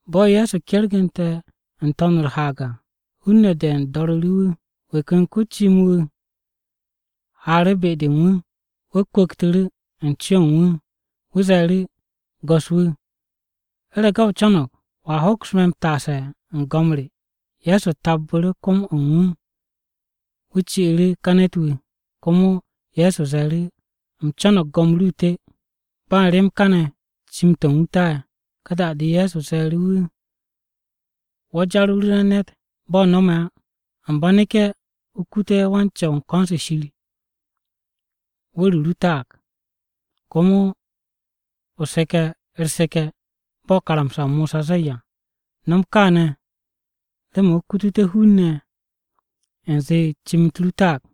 Bo̱ Ye̱so kyergu̱nte̱ n-to̱n u̱r-haag à, hun-ne̱ de̱e̱n do̱ru̱ru̱ wu̱. Wu̱ ken ko-cim-wu̱, haaru̱ be-de u̱n wu̱, wu̱ kwu̱ktu̱ru̱ u̱n co-o̱ u̱n wu̱. Wu̱ ze̱e̱ru̱, “Go̱s-wu̱, u̱rege̱ o co̱no̱g, wo̱a hoks me̱ m-taase̱ u̱n go̱m re.” Ye̱so tabbu̱ru̱ kom-o̱ u̱n wu̱, wu̱ ci'u̱ru̱ ká ne̱t-wu̱. Komo Ye̱so ze̱e̱ru̱, “U̱m co̱no̱g, go̱m ru te.” Ba u̱n rem káne̱, cim-to̱ u̱n wu̱ ta'e̱. Ka da-de Ye̱so ze̱e̱ru̱ wu̱, “Wo̱ jar o ru̱re̱ ne̱t bo̱ no̱me̱ á. Amba neke̱, o kute̱ wan-Co̱w u̱n ko̱n-se Shir, wu̱r-o ru taag. Komo o seke̱ u̱r-seke̱ bo̱ karamsa-o Mosa zee à. No̱m kaane̱ remen o kututé̱ hun-ne̱ u̱nze cim-u̱t ru taag.”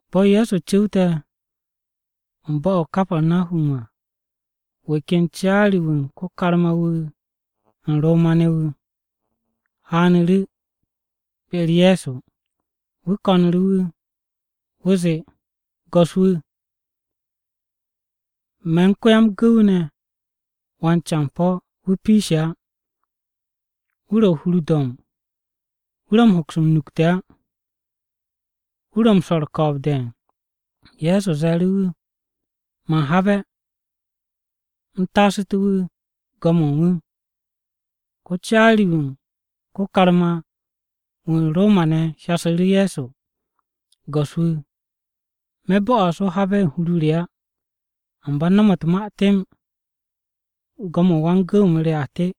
Bo̱ Ye̱so cu̱wte̱ u̱n bo̱-o̱ o-Kapanahum à, wu̱ ken caari-wu̱ u̱n ko-karma-wu̱ u̱n Roma-ne̱, wu̱ haanu̱ru̱ be-de u̱n Ye̱so. Wu̱ ko̱nu̱ru̱ wu̱, wu̱ zee, “Go̱s-wu̱, me̱ u̱n ko-ya-m-gu̱w ne̱ wan-campo̱ wu̱ piishe̱ á. Wu̱ ro̱ o-hur do̱mb, wu̱ ro̱ m-hoks m-nukte̱ á, wu̱ ro̱ m-swo̱ u̱r-ko̱o̱b de̱e̱n.” Ye̱so ze̱e̱ru̱ wu̱, “Man habe̱, u̱m taasu̱té̱ wu̱ go̱m-o̱ u̱n wu̱.” Ko-caari-wu̱ u̱n ko-karma-wu̱ u̱n Roma-ne̱ shasu̱ru̱ Ye̱so, “Go̱s-wu̱, me̱ bo'os o habe̱ u̱n hur-o re á, amba no̱m u̱t-ma temb, go̱m-o̱ u̱n wan-gu̱w-m re a te.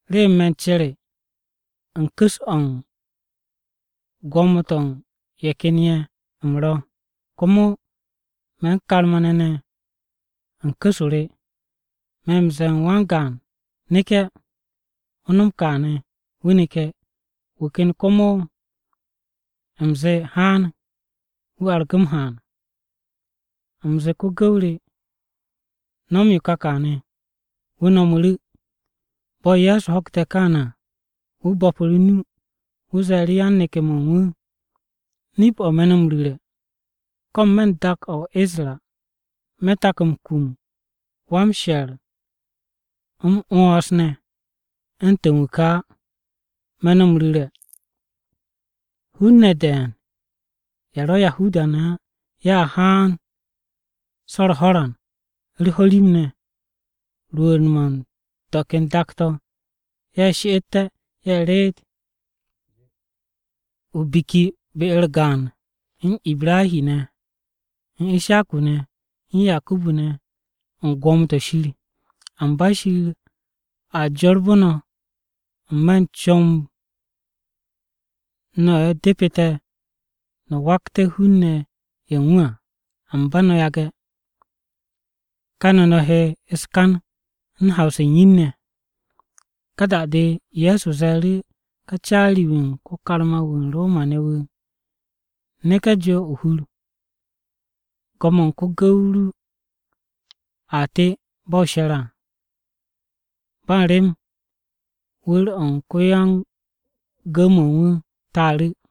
Remen me̱ u̱n ce re u̱n ku̱s-o̱ u̱n gwo̱mo-to̱ u̱n ye̱ ken ye̱ u̱m ro̱, komo me̱ u̱n karma-ne̱ u̱n ku̱s-o re. Me̱ m-ze̱e̱ u̱n wan-gaan, ‘Neke̱, o nom kàane̱,’ wu̱ neke̱. Wu̱ ken komo me̱ m-ze̱e̱, ‘Haan,’ wu̱ argu̱ m-haan. U̱m zee ko-gu̱w re, ‘No̱m yo ká káane̱,’ wu̱ no̱mu̱ru̱.” Bo̱ Ye̱so ho̱gu̱te̱ kaane̱ à, wu̱ bo̱pu̱ru̱ o-nu. Wu̱ ze̱e̱ru̱ yan-neke̱-mo̱ u̱n wu̱, “Nip-o̱ me̱ no̱ m-ru̱re̱, ko̱ n-me̱ u̱n dak-o̱ o-Isra me̱ tak m-kum wa-m-she̱r m-'wo̱ns ne̱ u̱ntu̱n wu̱ ka á. Me̱ no̱ m-ru̱re̱ hun-ne̱ de̱e̱n ye̱ ro̱ Yahuda-ne̱ á ye̱a haan so̱ u̱r-ho̱ran, u̱r-ho̱rim ne̱ rwu̱u̱n-mo̱ u̱n to̱ ken dak-to̱. Ye̱ she'ette̱ ye̱ reet o-biki be-u̱r gaan u̱n Ibrahi ne̱ u̱n Ishaku ne̱ u̱n Yakubu ne̱ u̱n Gwo̱mo-to̱ Shir. Amba Shir a jorbu̱ no̱ n-me̱ o-comb no̱ ye̱ depete̱ no̱ wakte̱ hun-ne̱ ye̱ u̱n wu̱ à, amba no̱ yage̱. Kane̱ no̱ he u̱s-kan u̱n haw-se u̱n yin-ne̱.” Ka da-de Ye̱so ze̱e̱ru̱ ka caari-wu̱ u̱n ko-karma-wu̱ u̱n Roma-ne̱ wu̱, “Neke̱ jo o-hur, go̱m-o̱ u̱n ko-gu̱w ru a te bo̱ o she̱re̱ à.” Ba u̱n rem, wu̱r-o̱ u̱n ko-yan-gu̱w-mo̱ u̱n wu̱ taaru̱.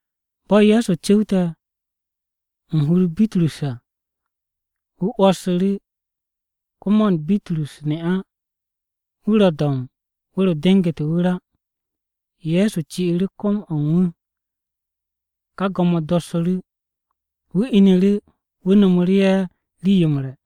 Bo̱ Ye̱so cu̱wte̱ u̱n hur-o Bitrus à, wu̱ 'wo̱su̱ru̱ ko-mo̱o̱n Bitrus ne'a wu̱ ro̱ do̱mb, wu̱r-o̱ dengu̱te̱ wu̱ o-ra. Ye̱so ci'u̱ru̱ kom-o̱ u̱n wu̱, ká go̱m-o̱ dossu̱ru̱. Wu̱ inu̱ru̱ wu̱ nomoru̱ ye̱ rii-yo m-re̱.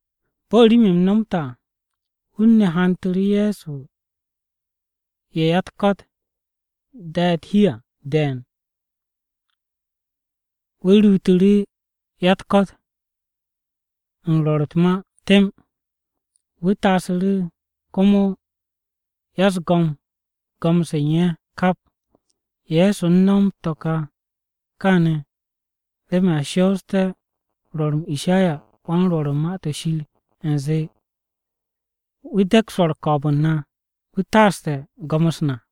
Bo̱ rim-m nomte̱ à, hun-ne̱ hantu̱ru̱ Ye̱so ye̱ ya-u̱t-ko̱t da'e̱ u̱t-hi à de̱e̱n. Wu̱ ruutu̱ru̱ ya-u̱t-ko̱t u̱n rwo̱r u̱t-ma temb. Wu̱ taasu̱ru̱ komo ya-u̱s-go̱m go̱m-se u̱n ye̱ kap. Ye̱so u̱n nom to̱ ká káane̱ remen a shoosté̱ rwo̱r-m Ishayawan-Rwo̱r u̱n Ma-to̱ Shir u̱nze, “Wu̱ de̱k swo̱ u̱r-ko̱o̱b u̱n na, wu̱ taaste̱ go̱m-u̱s na.”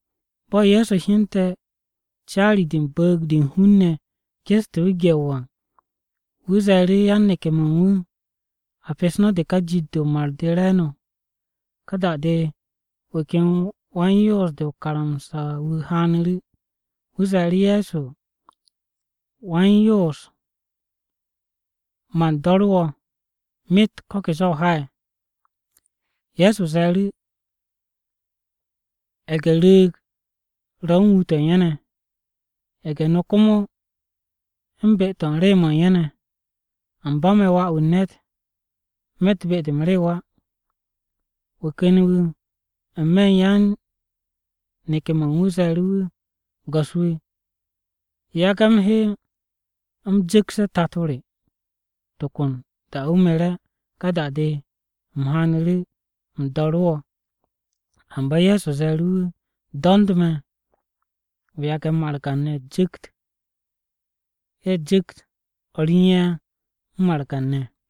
Bo̱ Ye̱so hyente̱ caari-de u̱n bu̱u̱g-de u̱n hun-ne̱ keste̱ wu̱ ge̱w à, wu̱ ze̱e̱ru̱ yan-neke̱-mo̱ u̱n wu̱, “A pes no̱ de ká jit-de o-mar de re̱e̱no̱.” Ka da-de wu̱ ken wan-Yoos-de o-karamsa haanu̱ru̱. Wu̱ ze̱e̱ru̱ Ye̱so, “Wan-yoos, man do̱ru̱ wo̱ myet ko̱ ke so̱ o ha'e̱.” Ye̱so ze̱e̱ru̱ wu̱, “E̱ge̱-ru̱u̱g ro̱ u̱n wu-to̱ u̱n ye̱ ne̱, ye̱ge̱-no komo u̱n be-to̱ u̱n rew-mo̱ u̱n ye̱ ne̱. Amba me̱ Wà-wu̱ u̱n ne̱t me̱tt be-de m-rew á.” Wu̱ ken wu̱ n-me̱ u̱n yan-neke̱-mo̱ u̱n wu̱ ze̱e̱ru̱ wu̱, “Go̱s-wu̱, yage̱ u̱m he u̱m ju̱kt tato re to̱ ko̱n da-o̱ wu̱ mere̱. Ka da-de u̱m haanu̱ru̱, u̱m do̱ru̱ru̱ wo̱.” Amba Ye̱so ze̱e̱ru̱ wu̱, “Do̱nd me̱, o yage̱ margan-ne̱ ye̱ o-ku̱kt, ye̱ ju̱kt o̱r u̱n ye̱ u̱n margan-ne̱.”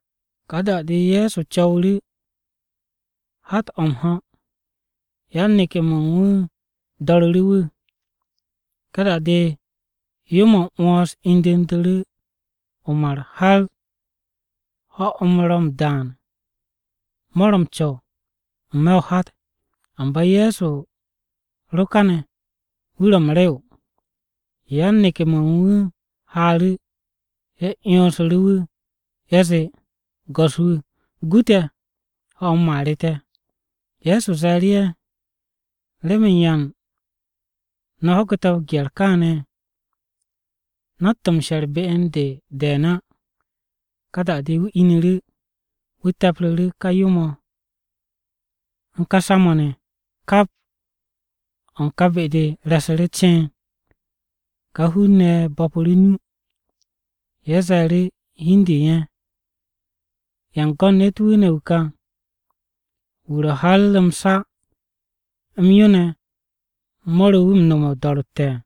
Ka da-de Ye̱so co̱wu̱ru̱ hat-o̱ m-ho̱, yan-neke̱-mo̱ u̱n wu̱ do̱ru̱ru̱ wu̱. Ka da-de yo-mo̱ m-'wo̱ns indu̱ndu̱ru̱ o-mar har ho̱-m ro m-daan mo̱ ro̱ m-co̱w n-me̱ o-hat, amba Ye̱so ro káne̱, wu̱ ro m-rew. Yan-neke̱-mo̱ u̱n wu̱ haaru̱, ye̱ 'yonsu̱ru̱ wu̱. Ye̱ zee, “Go̱s-wu̱, gu te̱, ho̱-m a re te̱!” Ye̱so ze̱e̱ru̱ ye̱, “¿Remen yan no̱ ho̱gu̱te̱ o-gye̱r kaane̱? No̱tt m-she̱r be u̱n de de̱e̱n á.” Ka da-de wu̱ inu̱ru̱, wu̱ te̱pru̱ru̱ ká yo-mo̱ u̱n ká sa-mo̱ ne̱, kap o̱ u̱n ká be-de re̱su̱ru̱ ceen. Ká hun-ne̱ bo̱pu̱ru̱ o-nu, ye̱ ze̱e̱ru̱ hi u̱n de u̱n ye̱, “¿Yan go̱n ne̱t-wu̱ ne̱ wu̱ ka, wu̱ ro̱ har m-sa m-yo ne̱ mo̱ ro̱ wu̱ m-nome̱ o-do̱ro̱tte̱?”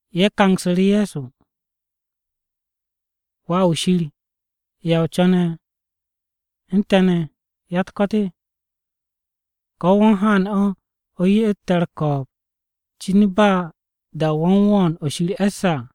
Ye̱ kangsu̱ru̱ Ye̱so, “Wà-wu̱ Shir, ¿ya o co̱ne̱ u̱n te̱ ne̱ ya-u̱t-ko̱t? ¿Ko̱ wo̱ u̱n haan o ye'et te̱ u̱r-ko̱o̱b cin ba da-o̱ u̱n wo̱o̱n o̱ Shir e̱sse̱ à?”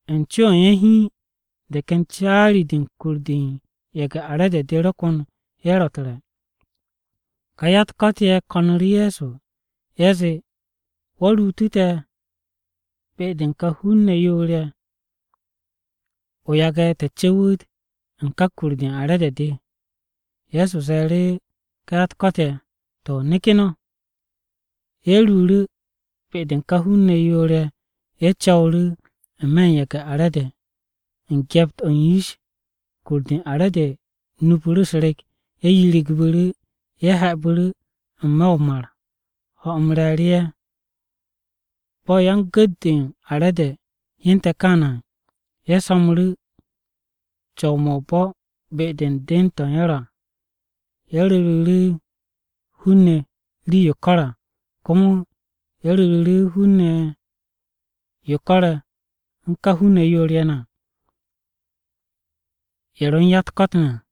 U̱n co-o̱ u̱n ye̱ hiin, de ken caari-de u̱n kur-de u̱n ye̱ge̱-are̱de ro ko̱n, ye̱ ro u̱t-re̱. Ká ya-u̱t-ko̱t ye̱ ko̱nu̱ru̱ Ye̱so, ye̱ zee, “Wo̱ ruutu̱ te̱ be-de u̱n ka hun-ne̱ yoor-ye̱, o yage̱ te̱ cu̱wu̱t u̱n ká kur-de u̱n are̱de de.” Ye̱so ze̱e̱ru̱ ká ya-u̱t-ko̱t ye̱, “To̱, neke̱ no̱.” Ye̱ ruuru̱ be-de u̱n ká hun-ne̱ yoor-ye̱, ye̱ co̱wu̱ru̱ n-me̱ u̱n ye̱ge̱-are̱de. U̱n gyept-o̱ u̱n yish, kur-de u̱n are̱de nupu̱ru̱ u̱s-rek ye̱ yiru̱gbu̱ru̱, ye̱ he̱bu̱ru̱ n-me̱ o-mar. Ho̱-m re̱e̱ru̱ ye̱. Bo̱ yan-gu̱t-de u̱n are̱de hyente̱ kaane̱ à, ye̱ so̱mu̱ru̱ co̱w-mo̱ o-bo̱ be-de den-to̱ u̱n ye̱ ro̱ à. Ye̱ ru̱ru̱ru̱ hun-ne̱ rii-yo ko̱re̱ à. Komo ye̱ ru̱ru̱ru̱ hun-ne̱ yo ko̱re̱ u̱n ká hun-ne̱ yoor-ye̱ ne̱ à, ye̱ ro u̱n ya-u̱t-ko̱t ne̱ à.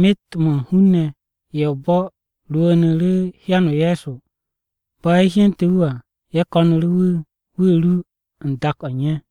Myet-mo̱ u̱n hun-ne̱ ye̱ o-bo̱ rwu̱u̱nu̱ru̱ hyan-o Ye̱so. Bo̱ ye̱ hyente̱ wu̱ à, ye̱ ko̱nu̱ru̱ wu̱, wu̱ ru u̱n dak-o̱ u̱n ye̱.